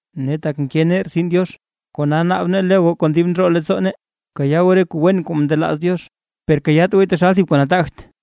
Ne tak nke nee rtsin Diox, kona naab nee lo goo kon dib ndroo leettsoo nee, bkayaa goo re kuu wen kuu ndelaaz Diox, per kayaat gooy taxal thib kuu nataagt.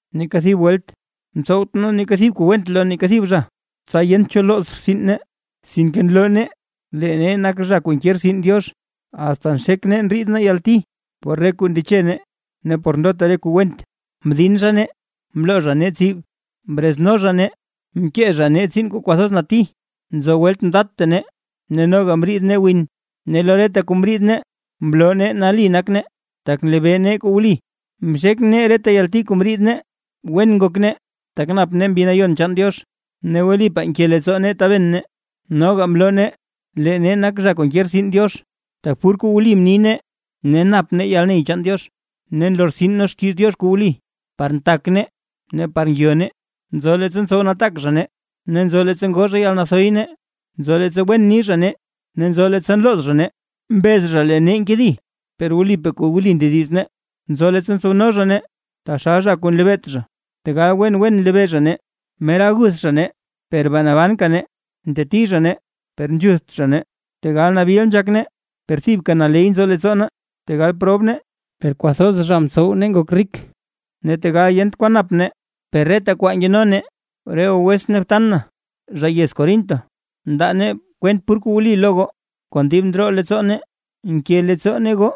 Neeka thib welt mtsowt nee neeka thib kuu went lo neeka thib zha, tsa yent cho looz rtsin nee. Sinke nloo nee, lee nee nak zha kuu nke rtsin Diox, asta nxek nee ndriid nee yalti por re kuu ndeche nee ne por ndota re kuu went, mdin zha nee, mloo zha nee tsib, mrezno zha nee, mke zha nee tsiin kuu kwathoz nati; nzo welt mdatta nee ne noga mriid nee win. Ne lo reta kuu mriid nee, mloo nee nali nak nee, tak nlebee nee kuu wli, mxek nee reta yalti kuu mriid nee, wen ngok nee, tak nap nee Mbi Nayon chaan Diox, ne wlipaa nke leettsoo nee taben nee. Noga mloo nee, lee nee nak zha kuu nke rtsin Diox, tak pur kuu wli ni nee, ne nap nee yalney chaan Diox, ne nlortsin nee xkiiz Diox kuu wli, par ntak nee ne par ngyo nee. Nzo leettsa ntsow nataak zha nee ne nzo leettsa ngoo zha yalnathoy nee, nzo leettsa wen ni zha nee ne nzo leettsa nlooz zha nee. Mbez zha lee nee nkedi, per wlipaa kuu wli ndediz nee. Nzo leettsa ntsowno zha nee taxal zha kuu nlebeet zha, tegal wen wen nlebee zha nee. Mera aguth zha nee, per bee nabanka nee; nteti zha nee, per nzhuth zha nee. Tegal nabil nzhak nee, per thibka naley nzo leettsoo nee; tegal prob nee, per kwathoz zha mtsow nee ngok rik; ne tegal yent kwan nap nee, per reta kwaa nkeno nee. Re goo wetsʼn ne btan na, zha yez Corinto, mndaa nee kwent pur kuu wli lo goo, kon dib ndroo leettsoo nee. Nke leettsoo nee goo,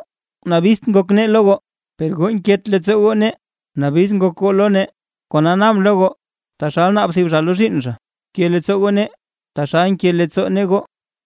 nabizt ngok nee lo goo, per goo nket leettsoo goo nee, nabiz ngok goo lo nee. Kona naabʼn lo goo, taxal naab thib zha lo zhiinn zha, bke leettsoo goo nee taxal nke leettsoo nee goo.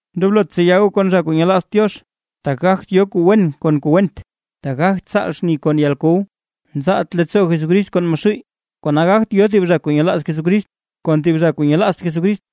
Ndoblot tseya goo kon zha kuu nyelaazt Diox, tak gagt yo kuu wen kon kuu went, ne gagt tsaal xni kon yalkow. Nzaalt leettsoo Jesucrist kon Maxuuy, kona gagt yo thib zha kuu nyelaaz Jesucrist kon thib zha kuu nyelaazt Jesucrist.